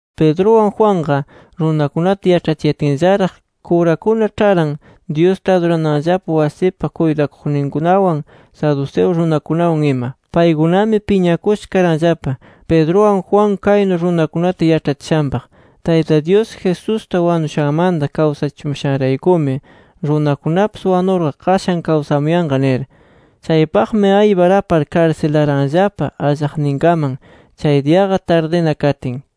Pedruwan Juanqa runakunata yaĉhachiyatinllaraq, kurakuna ĉharan, Dyusta adurananllapa wasipa kuytakuqninkunawan, saduceo runakunawan ima. Paykunami piñakusha karanllapa, Pedruwan Juan, kaynu runakunata yaĉhachishanpaq: “Tayta Dyus, Jesusta wanushanmanta kawsachimushanraykumi runakunapis wanurqa qashan kawsamuyanqa” nir. Chaypaqmi aypar, apar karsilaranllapa allaqninkaman, chay diyaqa tardina katin.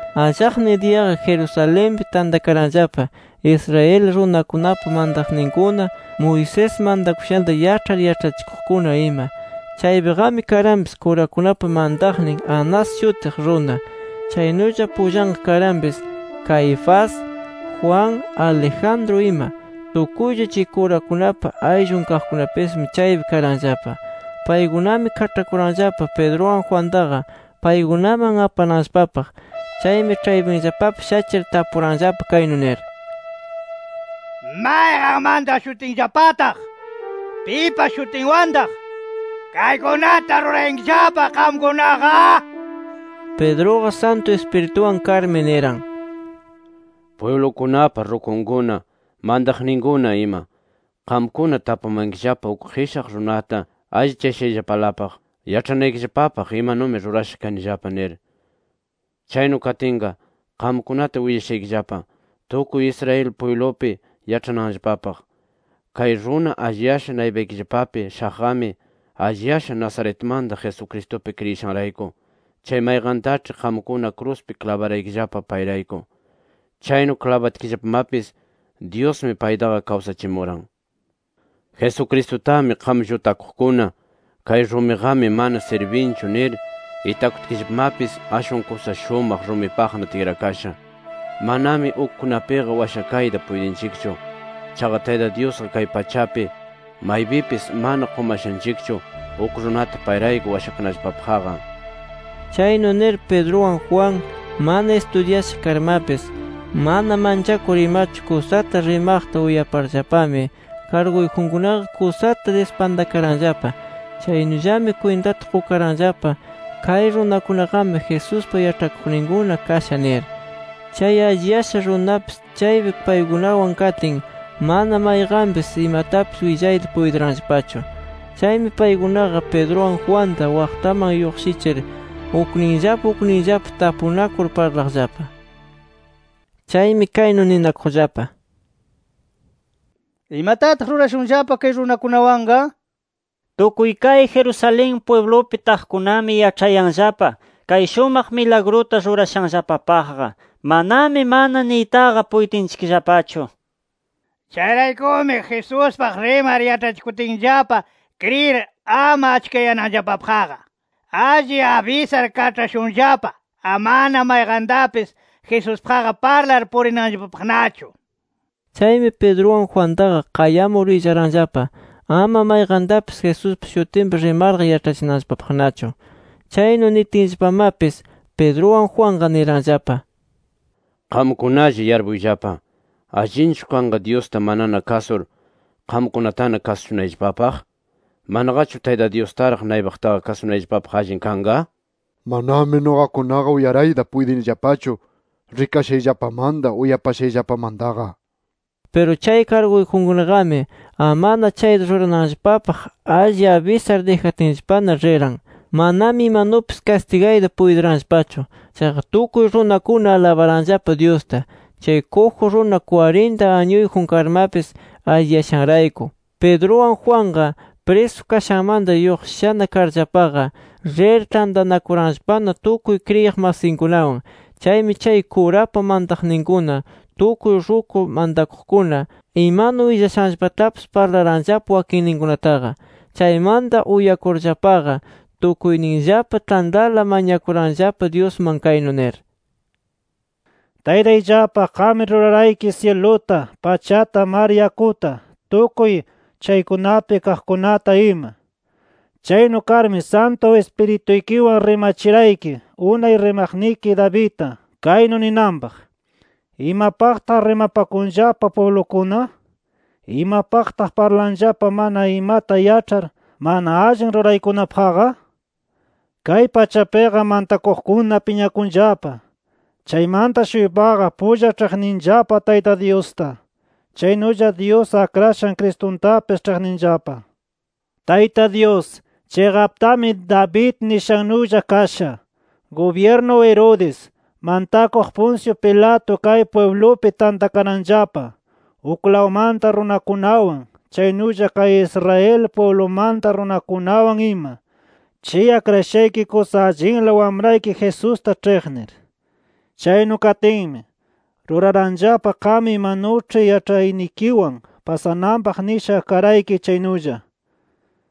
Allaqnin diyaqa Jerusalenpi tantakaranllapa, Israel runakunapa mantaqninkuna, Moisés mantakushanta yaĉhar yaĉhachikuqkuna ima. Chaypiqami karanpis, kurakunapa mantaqnin Anas shutiq runa. Chaynulla pullanqa karanpis Caifás, Juan, Alejandro ima. Tukuylla chay kurakunapa ayllun kaqkunapismi, chaypi karanllapa. Paykunami kaĉhakuranllapa, Pedruwan Juantaqa paykunaman apananllapapaq. Chaymi ĉhaypinllapapi shachir tapuranllapa, kaynu nir: —¿Mayqan mantashutinllapataq, pipa shutinwantaq, kaykunata rurayankillapa qamkunaqa? nir. Pedruqa Santu Ispirituwan karmi, niran: —Pwiblukunapa rukunkuna, mantaqninkuna ima. Qamkuna tapumankillapa uk qishaq runata allichashayllapalapaq, yaĉhanaykillapapaq imanumi rurasha kanillapa, nir. Chaynu katinqa, qamkunata willashaykillapa, tukuy Israel pwiblupi yaĉhananllapapaq. Kay runa alliyasha naypaykillapapi shaqqami, alliyasha Nazaretmanta Jesucristupi kriyishanrayku, chay mayqantaĉhi qamkuna kruspi klabaraykillapa, payrayku. Chaynu klabatkillapamapis Dyusmi paytaqa kawsachimuran. Jesucristutami qam llutakuqkuna, kay rumiqami mana sirbinchu nir itakutkillapamapis, ashwan kusa shumaq rumipaqna tikrakasha. Manami ukkunapiqa washakayta puytinchikchu. Chaqa Tayta Dyusqa kay pachapi, maypipis mana qumashanchikchu uk runata payrayku washakanallapapaqqa nir. Chaynu nir, Pedruwan Juan mana istudyasha karmapis, mana manchakur imachu kusata rimaqta uyaparllapami karguyjunkunaqa kusata dispantakaranllapa. Chaynullami kwintata qukaranllapa, kay runakunaqami Jesuspa yaĉhakuqninkuna kasha nir. Chay alliyasha runapis chaypi paykunawan katin, mana mayqanpis imatapis willayta puytiranllapachu. Chaymi paykunaqa, Pedruwan Juanta waqtaman lluqshichir, ukninllapa ukninllapa tapunakur parlaqllapa. Chaymi kaynu ninakuqllapa: “¿Imatataq rurashunllapa kay runakunawanqa? Tukuy kay Jerusalén pwiblupi taqkunami yaĉhayanllapa kay shumaq milagruta rurashanllapapaqqa, manami mana niytaqa puytinchikllapachu. Chayraykumi, Jesuspaq rimar yaĉhachikutinllapa kriyir, ama achkayananllapapaqqa, alli abisar kaĉhashunllapa amana mayqantapis Jesuspaqqa parlar purinanllapapaqnachu”. Chaymi Pedruwan Juantaqa, qayamur willaranllapa, ama mayqantapis Jesuspa shutinpi rimarqa yaĉhachinanllapapaqnachu. Chaynu nitinllapamapis, Pedruwan Juanqa niranllapa: —Qamkunalla yarpuyllapa. ¿Allinchu kanqa Dyusta manana kasur qamkunatana kasushunayllapapaq? ¿Manaqachu Tayta Dyustaraq naypaqtaqa kasunayllapapaq allin kanqa? Manami nuqakunaqa uyarayta puytinillapachu rikashayllapamanta, uyapashayllapamantaqa. Piru chay karguyjunkunaqami amana chayta rurananllapapaq alli abisar, dijatinllapana riran. Manami imanupis kastigayta puytiranllapachu. Chaqa tukuy runakuna alabaranllapa Dyusta, chay kuju runa kwarinta añuyjun karmapis alliyashanrayku. Pedruwan Juanqa, prisu kashanmanta lluqshishana karllapaqa, rir tantanakuranllapana tukuy kriyiq masinkunawan. Chaymi chay kurapa mantaqninkuna, tukuy ruku mantakuqkuna, imanu willashanllapatapis, parlaranllapa wakinninkunataqa. Chaymanta uyakurllapaqa, tukuyninllapa tantala mañakuranllapa Dyusman, kaynu nir: “Taytayllapa qammi rurarayki syiluta, pachata, mar yakuta, tukuy chaykunapi kaqkunata ima. Chaynu karmi Santu Ispirituykiwan rimachirayki unay rimaqniki Davidta, kaynu ninanpaq: ‘¿Imapaqtaq rimapakunllapa pwiblukuna? ¿Imapaqtaq parlanllapa mana imata yaĉhar, mana allin ruraykunapaqqa? Kay pachapiqa mantakuqkuna piñakunllapa, chaymanta-shuypaqa pulla ĉhiqninllapa Tayta Dyusta. Chaynulla Dyus Akrashan Cristuntapis ĉhiqninllapa’. “Tayta Dyus, chiqaptami David nishannulla kasha. Gubyirnu Herodes, mantakuq Poncio Pilato kay pwiblupi tantakaranllapa, uklawmanta runakunawan, chaynulla kay Israel pwiblumanta runakunawan ima, chay akrashayki kusa allinla Wamrayki Jesusta ĉhiqnir. Chaynu katinmi, ruraranllapa qam imanuĉhi yaĉhaynikiwan pasananpaq nisha karayki chaynulla.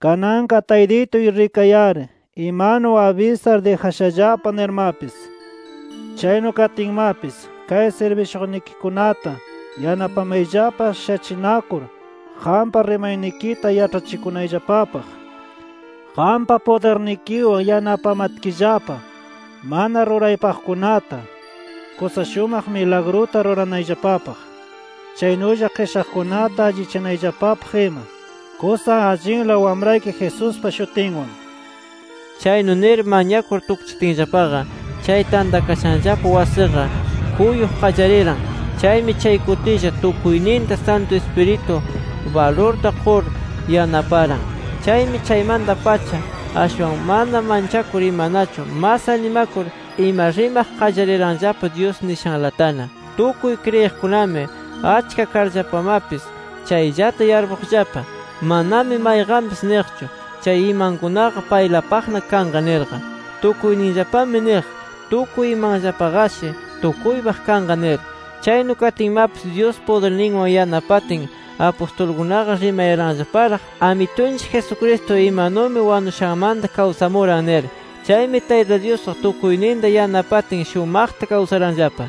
Kananqa Taytituy rikay-ari imanu abisar dijashallapa nirmapis. Chaynu katinmapis kay sirbishuqnikikunata yanapamayllapa shachinakur qampa rimanaykita yaĉhachikunayllapapaq. Qampa pudirnikiwan yanapamatkillapa, mana ruraypaqkunata, kusa shumaq milagruta ruranayllapapaq. Chaynulla qishaqkunata allichanayllapapaq ima, kusa allinla Wamrayki Jesuspa shutinwan” nir. Chaynu nir mañakur tukchitinllapaqa, chay tantakashanllapa wasiqa kuyuq qallariran. Chaymi chay kutilla, tukuyninta Santu Ispiritu balurta qur yanaparan. Chaymi chaymanta-pacha ashwan mana manchakur imanachu mas animakur ima rimaq qallariranllapa Dyus nishanlatana. Tukuy kriyiqkunami achka karllapamapis, chayllata yarpuqllapa. Manami mayqanpis niqchu, chay imankunaqa paylapaqna kanqa nirqa. Tukuyninllapami niq tukuy imanllapaqashi tukuypaq kanqa nir. Chaynu katinmapis, Dyus pudirninwan yanapatin apustulkunaqa rimayaranllaparaq, Amitunchik Jesucristo imanumi wanushanmanta kawsamuran nir. Chaymi Tayta Dyusqa tukuyninta yanapatin shumaqta kawsaranllapa.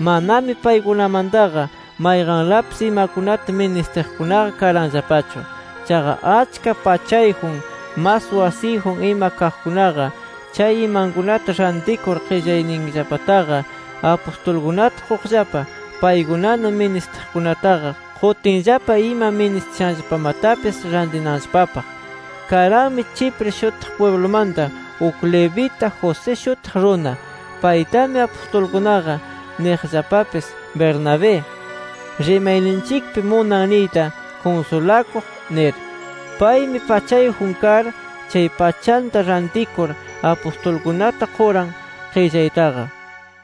Manami paykunamantaqa, mayqanlapis imakunata ministiqkunaqa karanllapachu. Chaqa achka pachayjun, mas wasiyjun ima kaqkunaqa, chay imankunata rantikur, qillayninllapataqa, apustulkunata quqllapa, paykunana ministiqkunataqa qutinllapa ima ministishanllapamatapis rantinanllapapaq. Karanmi Chipre shutiq pwiblumanta uk Levita, José shutiq runa. Paytami apustulkunaqa niqllapapis Bernabé (rimayninchikpi munan niyta “Kunsulakuq”) nir. Paymi pachayjun kar, chay pachanta rantikur apustulkunata quran qillaytaqa.